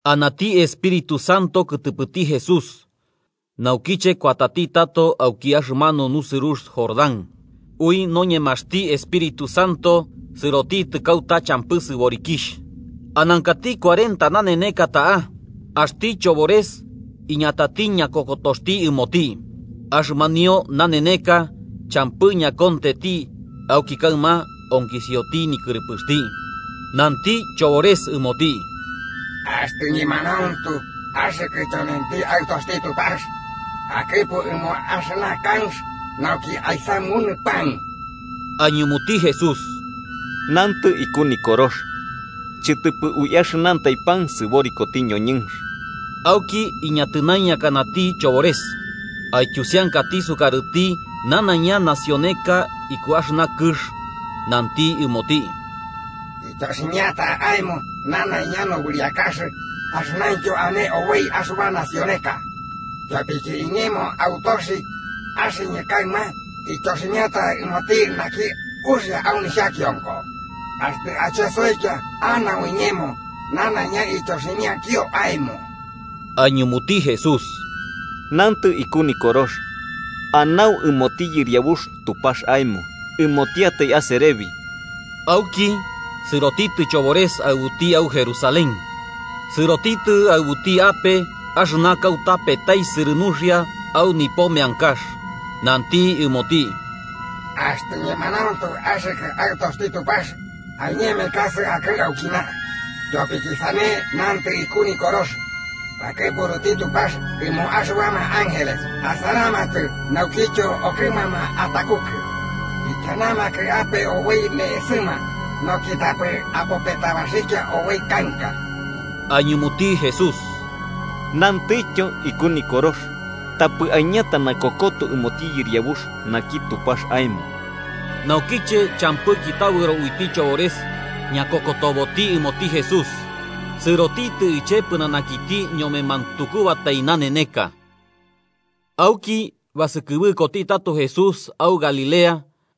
Anati Espíritu Santo kɨtɨpɨti Jesús, naukiche kuatati tato auki axɨmanu nusɨrux Jordán, ui noñemaxti Espíritu Santo sɨrotitɨ kauta champɨ sɨborikixh. Anankati cuarenta naneneka ta'a, axti chobores iñatati ñakokotoxti ɨmoti. Axɨmanio naneneka champɨ ñakontenti, auki kaɨma onkisioti nikɨrɨpɨxti. Nanti chobores ɨmoti: –Axtɨ ñemanauntu axɨkɨ tyonenti Aɨtoxti Tupax, akɨpu ɨmo axɨna kanx nauki aisamunɨ pan. Aiñumuti Jesús: –Nantɨ iku Nikorox: ‘Chɨtɨpɨ ui axɨnantai pan sɨborikoti ñoñɨnx.’ Auki iñatɨnaiñakanati chobores, aityusiankati sukarɨti nanaiña nacioneka iku axɨna kɨx, nanti ɨmoti: –Ityoximiata aemo nanaiña nobɨriakax axɨnaintyo ane oboi axɨba nacioneka. Tyopiki iñemo autoxi, axɨñɨ kaɨma ityoximiata ɨmoti naki uxia au nixhakionko. Axtɨ achesoikia anau iñemo nanaiña ityoximiakio aemo. Aiñumuti Jesús: –Nantɨ iku Nikorox: ‘Anau ɨmoti Yɨriabux Tupax aemo, ɨmotiatai aserebi.’ Auki sɨrotitɨ chobores aɨbuti au Jerusalén, sɨrotitɨ aɨbuti ape axɨna kauta petaisɨrɨ nuxia au nipo meankax nanti ɨmoti: –Axtɨ ñemanauntu axɨkɨ Aɨtoxti Tupax, aiñemekasɨ akɨ'ɨ aukina. Tyopiki sane nantɨ iku Nikorox: ‘Bakɨpuruti Tupax ɨmo axɨbama ángeles asaramatɨ naukityo okɨmama atakukɨ. Ikianamakɨ ape oboi ne'esɨma, nauki tapɨ apopetabaxikia oboi kanka.’ Aiñumuti Jesús: –Nantityo iku Nikorox: ‘Tapɨ aiñata nakokoto ɨmoti Yɨriabux naki Tupax aemo.’ Naukiche champɨki tabɨro uiti chobores ñakokotoboti ɨmoti Jesús, sɨrotitɨ iche pɨnanakiti ñome mantukubatai naneneka. Auki basɨkɨbɨkoti tato Jesús au Galilea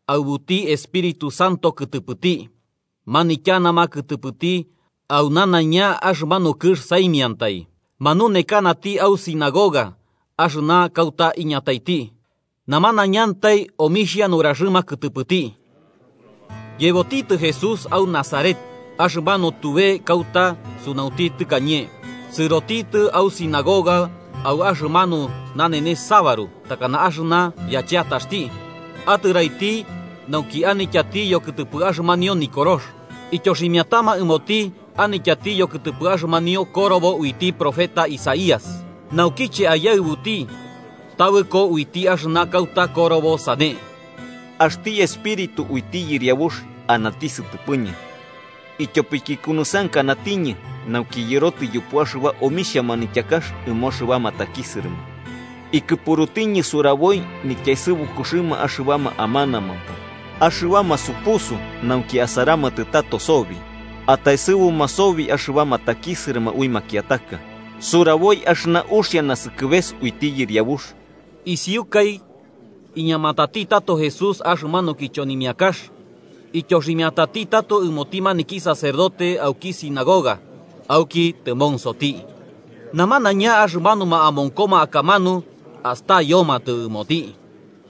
aɨbuti Espíritu Santo kɨtɨpɨti, manityanama kɨtɨpɨti au nanaiña axɨmanu kɨx saimiantai. Manunekanati au sinagoga axɨna kauta iñataiti, namanaiñantai omixhia nuraxɨma kɨtɨpɨti. Yebotitɨ Jesús au Nazaret, axɨmanu tube kauta sunaunti tɨkañe. Sɨrotitɨ au sinagoga au axɨmanu nanenes sabaru, takana axɨna yacheataxti, atɨraiti nauki anityati yokɨtɨpɨ axɨmanio Nikorox. Ityoximiatama ɨmoti anityati yokɨtɨpɨ axɨmanio korobo uiti profeta Isaías, naukiche aiyaɨbuti tabɨko uiti axɨna kauta korobo sane: “Axti Espíritu uiti Yɨriabux anati sɨtɨpɨñɨ, ityopiki ikunusɨankanatiñɨ nauki yɨrotɨ yupu axɨba omixhia manityakax ɨmo axɨbama takisɨrɨma. Ikɨpurutiñɨ suraboi nityaesɨbukuxɨma axɨbama amanamampo axɨbama supusu nauki asaramatɨ tato sobi. Ataesɨbuma sobi axɨbama takisɨrɨma ui makiataka. Suraboi axɨna uxia nasɨkɨbeka uiti Yɨriabux.” Isiukai iñamatati tato Jesús axɨmanu kichonimiakax, ityoximiatati tato ɨmoti maniki sacerdote auki sinagoga auki tɨmonsoti. Namanaiña axɨmanuma amonkoma akamanu astayomatɨ ɨmoti.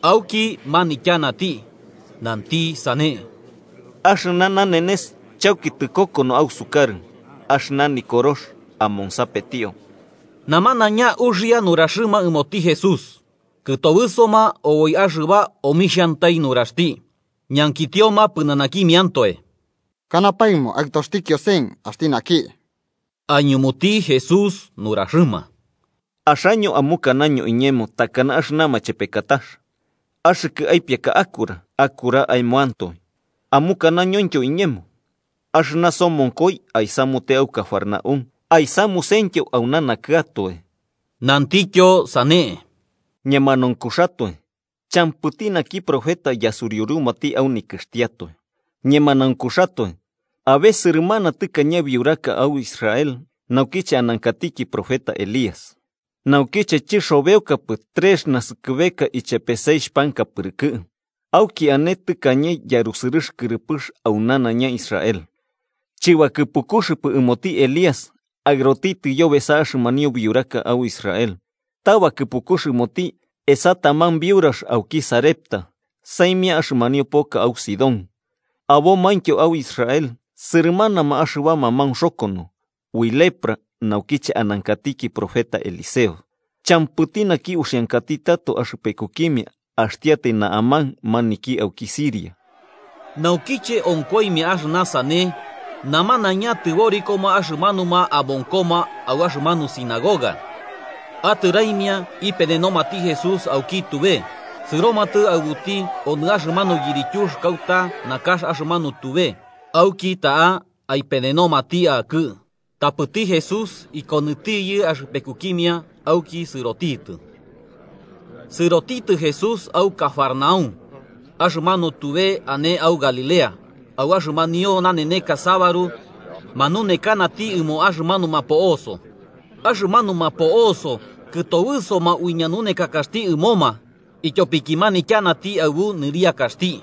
Auki manityanati, nanti sane: –Axɨna nanenes chauki tɨkokono ausukarɨ axɨna Nikorox amonsapetio. Namanaiña uxia nuraxɨma ɨmoti Jesús kɨtobɨsoma oboi axɨba omixhantai nuraxti. Ñankitioma pɨnanakimiantoe: –¿Kanapaemo aɨtoxti Kiosen axti naki? Aiñumuti Jesús nuraxɨma: –Axaño amukanaño iñemo takana axɨna machepekatax: ‘Axɨkɨ aipiaka akura, akura aemoantoe.’ Amukanañointyo iñemo: ‘Axɨna somonkoi aisamute au Cafarnaúm, aisamusentyo auna nakɨatoe.’ Nantikityo sane: –Ñemanaunkuxatoe, champɨti naki profeta yasuriurumati au nikɨxtiatoe. Ñemanaunkuxatoe, abe sɨrɨmana tɨkañe biuraka au Israel naukiche anankatiki profeta Elías, naukiche chɨxobeokapɨ trex naskɨbeka ichepe seixh panka pɨrɨkɨ, auki ane tɨkañe yarusɨrɨx kɨrɨpɨx au nanaiña Israel. Chɨbakɨpukuxɨpɨ ɨmoti Elías aɨrotitɨ yobesa axɨmanio biuraka au Israel, ta bakɨpukux ɨmoti esa taman biurax auki Sarepta, saimia axɨmanio poka au Sidón. Abomaintyo au Israel sɨrɨmanama axɨbama maunxokono, ui lepra naukiche anankatiki profeta Eliseo, champɨti naki uxiankati tato axɨpekukimia, axtiatai Naamán, maniki auki Siria. Naukiche onkoimia axɨna sane, namanaiña tɨborikoma axɨmanuma amonkoma au axɨmanu sinagoga. Atɨraimia ipenenomati Jesús auki tube, sɨromatɨ aɨbuti onɨ axɨmanu yirityux kauta nakax axɨmanu tube, nauki auki ta'a aipenenomati akɨ'ɨ. Tapɨti Jesús ikonɨtiyɨ axɨpekukimia auki sɨrotitɨ. Sɨrotitɨ Jesús au Cafarnaúm, axɨmanu tube ane au Galilea, au axɨmanio naneneka sabaru manunekanati ɨmoma axɨmanuma po'oso. Axɨmanuma po'oso kɨtobɨsoma ui ñanunekakaxti ɨmoma, ityopiki manityanati aɨbu nɨriakaxti.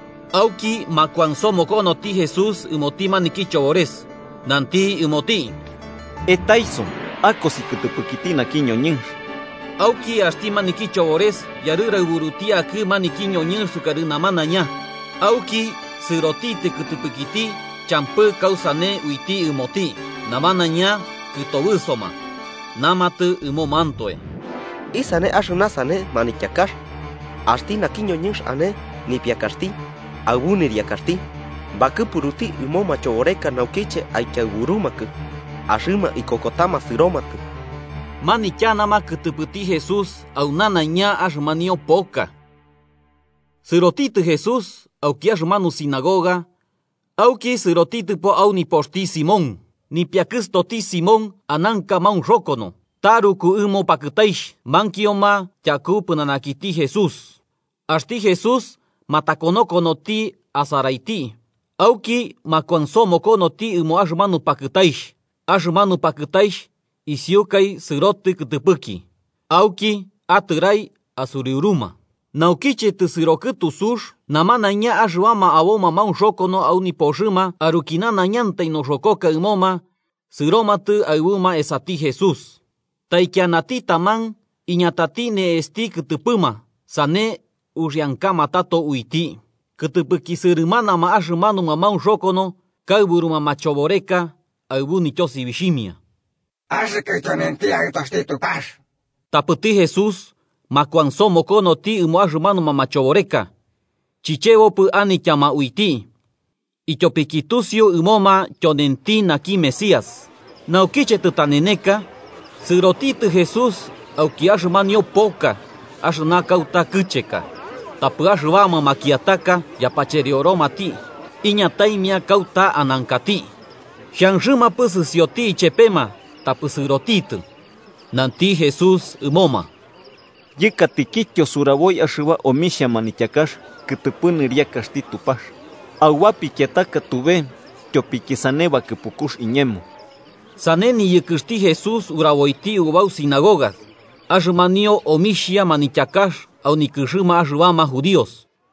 Auki makuansomokonoti Jesús ɨmoti maniki chobores, nanti ɨmoti: –¡Etaiso akosi kɨtɨpɨkiti naki ñoñɨnx! Auki axti maniki chobores yarɨraɨburuti akɨ maniki ñoñɨnx sukarɨ namanaiña, auki sɨrotitɨ kɨtɨpɨkiti champɨ kausane uiti ɨmoti. Namanaiña kɨtobɨsoma, namatɨ ɨmomantoe: –¿Isane axɨna sane manityakax? Axti naki ñoñɨnx ane nipiakaxti aɨbu nɨriakaxti bakɨpuruti ɨmo machoboreka naukiche aikiaɨburumakɨ, ¡axɨma ikokotama sɨromatɨ! Manityanama kɨtɨpɨti Jesús au nanaiña axɨmanio poka. Sɨrotitɨ Jesús auki axɨmanu sinagoga auki sɨrotitɨpo au nipoxti Simón. Nipiakɨstoti Simón ananka maunxokono, taruku ɨmo pakɨtaixh, mankioma tyaku pɨnanakiti Jesús. Axti Jesús matakonokonoti asaraiti auki makuansomokonoti ɨmo axɨmanu pakɨtaixh, axɨmanu pakɨtaixh isiukai sɨrotɨ kɨtɨpɨki. Auki, atɨrai asuriuruma. Naukiche tɨsɨro kɨtu sux, namanaiña axɨbama aboma maunxokono au nipoxɨma aruki nanaiñantai noxokoka ɨmoma sɨromatɨ aɨbuma esati Jesús. Taikianati taman iñatati ne'exti kɨtɨpɨma, sane uxiankama tato uiti. Kɨtɨpɨki sɨrɨmanama axɨmanuma maunxokono kaɨburuma machoboreka, aɨbu nityosibixhimia: –¡Axɨkɨ tyonenti Aɨtoxti Tupax! Tapɨti Jesús makuansomokonoti ɨmo axɨmanuma machoboreka chichebopɨ anityama uiti, ityopiki tusiu ɨmoma tyonenti naki Mesías. Naukiche tɨtaneneka, sɨrotitɨ Jesús auki axɨmanio poka, axɨna kauta kɨcheka. Tapɨ axɨbama makiataka yapacherioromati, iñataimia kauta anankati. Xhanxɨmampɨ sɨsioti ichepema, tapɨ sɨrotitɨ, nanti Jesús ɨmoma: –Yɨkatikityo suraboi axɨba omixhia manityakax kɨtɨpɨ nɨriakaxti Tupax auba pikiataka tube tyopiki sane bakɨpukux iñemo. Sane niyɨkɨxti Jesús uraboiti ubau sinagogas axɨmanio omixhia manityakax au nikɨxɨma axɨbama judíos.